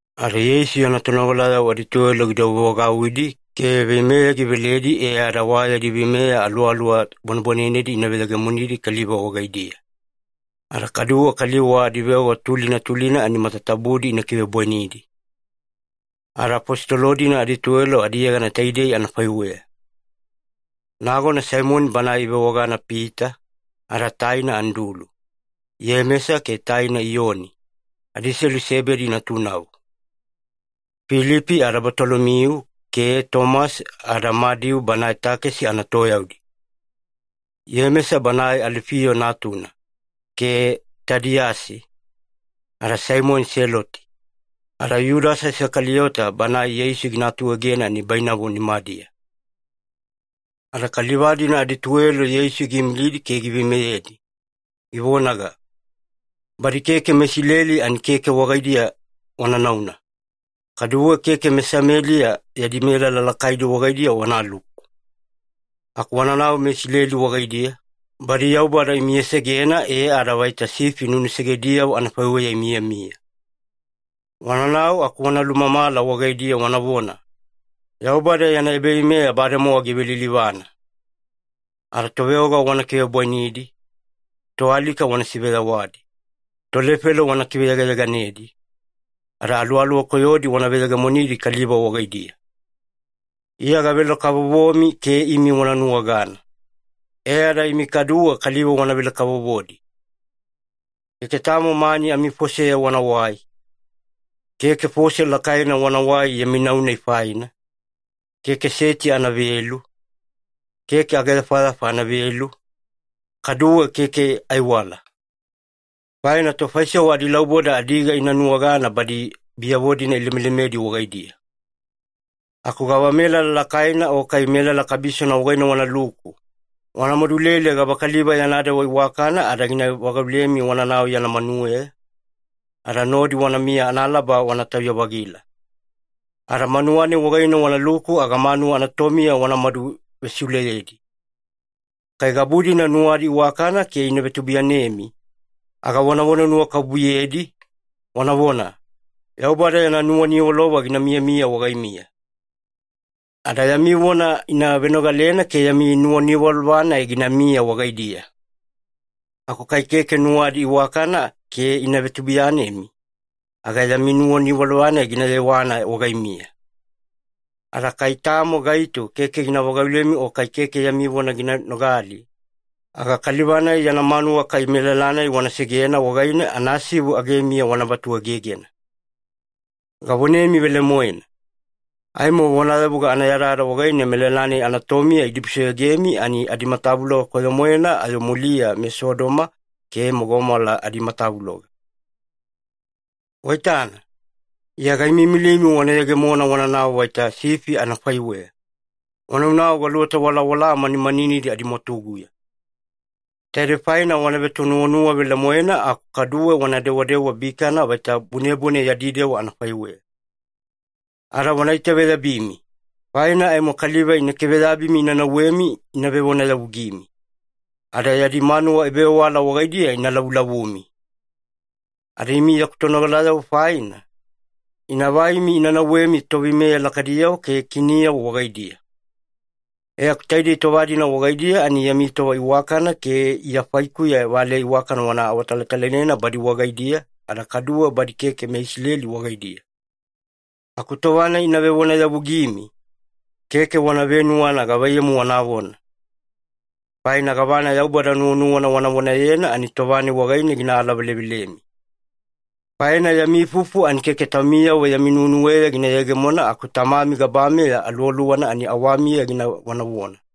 Ada Yeisu yana tonogalayavo adituwelo gidouwevagauwidi ke veimeya giveledi e ada wa yadi veimeya aluwaluwa bwanebwanenedi ina veyegemonidi kaliva wagaidiya, ada kaduwe kaliva wa adiveoga tulina tulina ani matatabudi ina kivebwainidi. Ada afositolo-dina adituwelo adiyegana taidei anafaiweya. Nagona Saimoni banae ivewagana Pita, ada taina Andulu, Iyemesa ke taina Iyoni, adiselu Sebedi natunavo. Filipi ada Batolomiu ke Tomasi ada Madiu banae takesi anatoyaudi, Iyemesa banae Alifiyo natuna, ke Tadiyasi, ada Saimoni Seloti, ada Yudasa Isakaliyota banae Yeisu gina atuegena nibainavo nimadiya. Ada kaliva-dina adituwelo Yeisu giimilidi ke giveimeyedi, givonaga, “Badi keke meIsileli ani keke wagaidiya wana nauna, kaduwe keke meSameliya yadi melala lakaidi wagaidiya wanaluku. Aku wananau meIsileli wagaidiya, badi Yaubada imiyasegena e ada vaita sifi nunusegediyavo anafaiweya imiyamiya. Wananau aku wana lulumamala wagaidiya wanavona, ‘Yaubada yana ebaveimeya bademowa givelilivana.’ Ada toveoga wana kivebwainidi, toalika wana siveyawadi, tolefelo wana kiveyegayeganedi, ada aluwaluwa koyodi wana veyegemonidi kaliva wagaidiya. Iya gavele-kavovomi ke imi wanuwagana, e ada imi kaduwe kaliva wanavele-kavovodi. Keke tamo mani amifoseya wanawai. Keke fose lakaina wanawai yami nau-nai faina, keke seti anavelu, keke ageyafayafa anavelu, kaduwe keke aiwala. Faina tofaisewa adilauboda adiga ina nuwagana badi biyavo-dina ilemelemedi wagaidiya. Aku gavamelala lakaina o kai melala kabisona wagaine wanaluku, wana madulele gavakaliva yana dewa iwakana ada gina vagaulemi wananau yana manuweya, ada nodi wanamiya analaba wana tauya-vagila. Ada manuwa-nai wagaine wanaluku aga manuwa anatomiya wanamadu vesiuleyedi. Kai gabu-dina nuwadi iwakana ke ina vetubuiyanemi, aga wanavona nuwakabubuyedi, wanavona, ‘Yaubada yana nuwaniwalova gina miyamiya wagaimiya.’ Ada yami vona ina venogalena ke yami nuwaniwalova-nai ginamiya wagaidiya. Aku kai keke nuwadi iwakana ke ina vetubuiyanemi, aga yami nuwaniwalova-nai gina yewana wagaimiya. Ada kai tamo gaito keke gina vagaulemi o kai keke yami vona gina nogali, aga kaliva-nai yana manuwa kai melala-nai wana segena wagaine, anasivu agemiya wana vatuegegena. Gavonemi velemoena, aimo vonayavuga anayadayada wagaine melala-nai anatomiya idibusoyogemi, ani adimatavuloga koyo-moena ayo muliya meSodoma ke meGomola adimatavuloga. “Waitana, Iya gaimiimilimi wana yegemona wananau vaita sifi anafaiweya, wanaunau galuweta walawala manimaninidi adimwatuguya. Taidei faina wana vetonuwanuwa velemoena, aku kaduwe wana dewadewa bikana vaita bunebune yadi dewa anafaiweya. Ada wana itaveyabimi, faina aimo kaliva ina kiveyabimi ina nauwemi ina vevonayavugimi, ada yadi manuwa ebavewala wagaidiya ina lavulavumi. Ada imi yaku tonogalayavo faina, ina vaimi ina nauwemi toveimeya lakaidiyavo ke kiniyavo wagaidiya. E aku taidei tova-dina wagaidiya ani yami tova iwakana ke Iya faikuya valeya iwakana wana awatalatalaina badi wagaidiya, ada kaduwe badi keke meIsileli wagaidiya. Aku tova-nai ina vevonayavugimi, keke wana venuwana gavaiyamu wanavona. Faina gavana Yaubada nuwanuwana wana vonayena ani tova-nai wagaine gina alavelevelemi. Faina yami ifufu ani keke taumiyavo yami nuwenuweya gina yegemona, aku Tamami gabameya Aluwaluwana ani awamiya gina vonavona.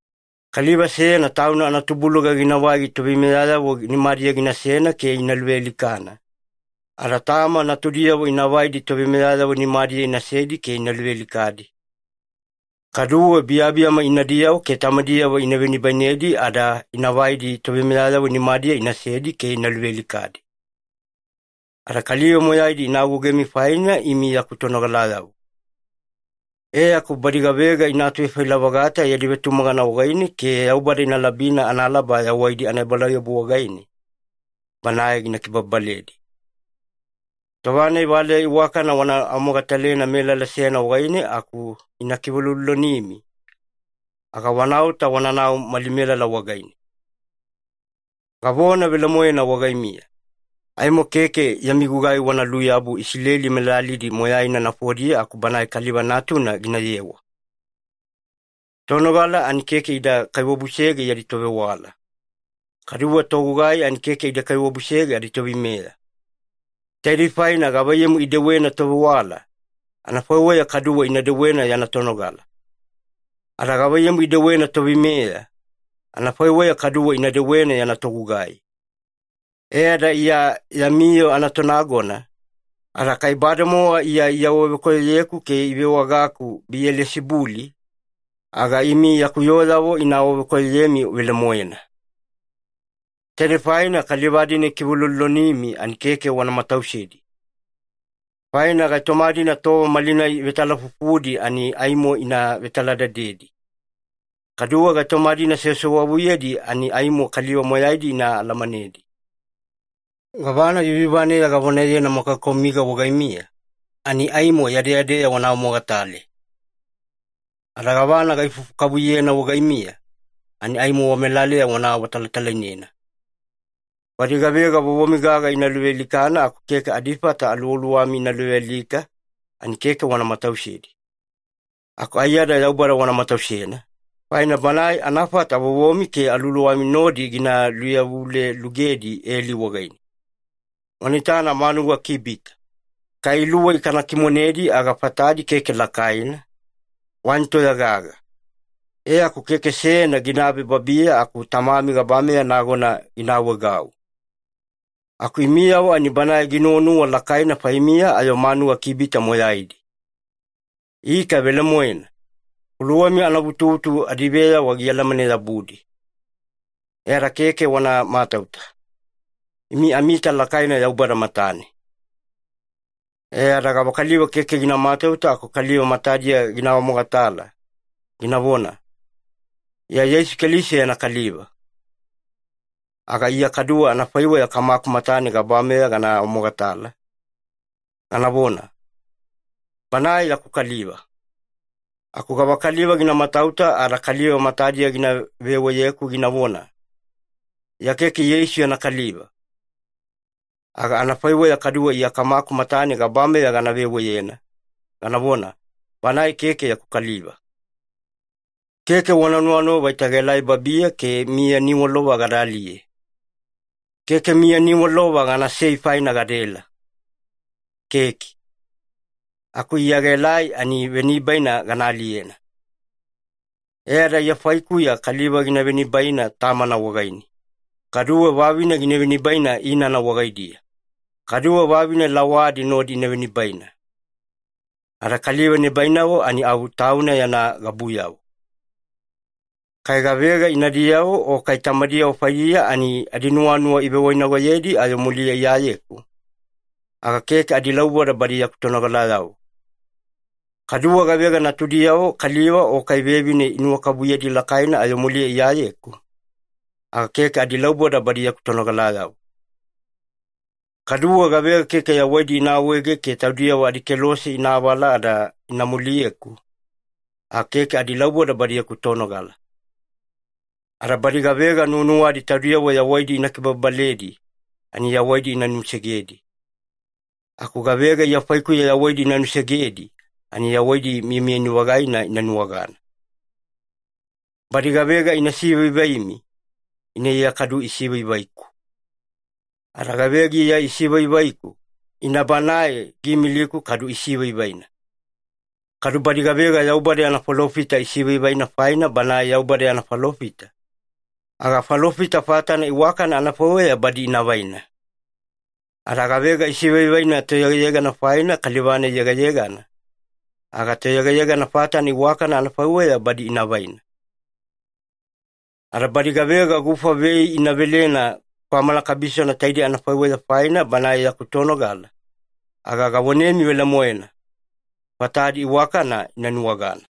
“Kaliva seyana tauna anatubuluga ginavai toveimeyayavo nimadiya ginasena ke ina luvealikana, ada tama natudiyavo ina vaidi toveimeyayavo nimadiya inasedi ke ina luvealikadi. Kaduwe biyabiyama inadiyavo ke tamadiyavo ina venibainedi ada ina vaidi toveimeyayavo nimadiya inasedi ke ina luvealikadi. Ada kaliva moyaidi ina agougemi, faina imi yaku tonogalayavo. E aku badi gavega ina atuvefaila-vagata yadi vetumagana wagaine ke Yaubada ina labina analaba yawaidi anaebalauyabu wagaine, Banae gina kibababaledi. Tova-nai valeya iwakana wana awamogatalena melala seyana wagaine aku ina kiveuloulolonimi, aga wanaota wananau mali melala wagaine. Gavona velemoena wagaimiya, aimo keke yami gugai wana luyabu Isileli melalidi moyaina nafodiya aku Banae Kaliva Natuna ginayewa. “Tonogala ani keke ida kaiwabusege yadi tovewala, kaduwe togugai ani keke ida kaiwabusege aditoveimeya. Taidei faina gavaiyamu idewena tovewala, anafaiweya kaduwe ina dewena yana tonogala. Ada gavaiyamu idewena toveimeya, anafaiweya kaduwe ina dewena yana togugai. E ada Iya yami yoo anatonagona, ada kai bademowa Iya iawavekoyoyeku ke ivewagaku Biyelisibuli, aga imi yaku yooyavo ina awavekoyoyemi velemoena. “Taidei faina kaliva-dina ikiveuloulolonimi ani keke wana matausedi. Faina gaitoma-dina tova malinai ivetalafufudi ani aimo ina vetaladadedi, kaduwe gaitoma-dina sewasewavuyedi ani aimo kaliva moyaidi ina alamanedi. Gavana yuyuvaneya gavonayena makakaumiga wagaimiya ani aimo yadeyadeya wana awamogatale. Ada gavana gaifufu kavuyena wagaimiya, ani aimo wamelaleya wana awatalatalainena. Badi gavega vovomi gaga ina luvealikana aku keke adifata aluwaluwami ina luvealika, ani keke wana matausedi. Aku aiyada Yaubada wana matausena, faina Banae anafata vovomi ke aluwaluwami nodi gina luyavulelugedi eli wagaine. Wana itana manuga kibita. Kai iluwei kana kimonedi aga fatadi keke lakaina, wani toya-gaga. E aku keke seyana ginabe babiya aku Tamami gabameya nagona gina awaegau. Aku imiyavo ani Banae ginuwanuwa lakaina faimiya ayo manuga kibita moyaidi. Ika velemoena, kuluwami anavutuvutu adiveyawa gialamane-yabudi. E ada keke wana matauta. Imi amiita lakaina Yaubada matane. “E ada gavakaliva keke gina matauta aku kaliva matadiya gina awamogatala, ginavona, ‘Iya Yeisu Keliso yana kaliva’, aga Iya kaduwe anafaiweya Kamaku matane gabameya gana awamogatala, ganavona, ‘Banae yaku kaliva’. Aku gavakaliva gina matauta ada kaliva matadiya gina veweyeku ginavona, ‘Iya keke Yeisu yana kaliva’, aga anafaiweya kaduwe Iya Kamaku matane gabameya gana veweyena, ganavona, ‘Banae keke yaku kaliva’. “Keke wana nuwanuwa vaita gaelai babiya ke miya niwalova gada aliye. Keke miya niwalova ganasei faina gadaela, keke. Aku Iya gaelai ani venibaina gana aliyena. E ada Iya faikuya ‘kaliva gina venibaina tamana wagaine, kaduwe vavine gina venibaina inana wagaidiya, kaduwe vavine lawadi nodi ina venibaina. Ada kaliva nibainavo ani au tauna yana gabuyavo.’ “Kai gavega inadiyavo o kai tamadiyavo faidiya ani adinuwanuwa ivewainagoyedi ayo muliya Iyayeku, aga keke adilauboda badi yaku tonogalayavo. Kaduwe gavega natudiyavo kaliva o kai vevine inuwakabubuyedi lakaina ayo muliya Iyayeku, aga keke adilauboda badi yaku tonogalayavo. Kaduwe gavega keke yawaidi ina awaege ke taudiyavo adikelose ina avala ada ina muliyeku, aga keke adilauboda badi yaku tonogala. Ada badi gavega nuwanuwadi taudiyavo yawaidi ina kibababaledi, ani yawaidi ina nusegedi. Aku gavega Iya faikuya yawaidi ina nusegedi, ani yawaidi miyamiyani-vagaina ina nuwagana. “Badi gavega imi ina sivaivaimi, ina Iya kadu isivaivaiku. Ada gavega Iya isivaivaiku, ina Banae giimiliku kadu isivaivaina. Kadu badi gavega Yaubada yana falofita isivaivaina faina banae Yaubada yana falofita, aga falofita fatana iwakana anafaiweya badi ina vaina. Ada gavega isivaivaina toyegayegana faina kaliva-nai yegayegana, aga toyegayegana fatana iwakana anafaiweya badi ina vaina. Ada badi gavega gufa vei ina velena kwamana kabisona taidei anafaiweya faina banae yaku tonogala, aga gavonemi velemoena, fatadi iwakana ina nuwagana.”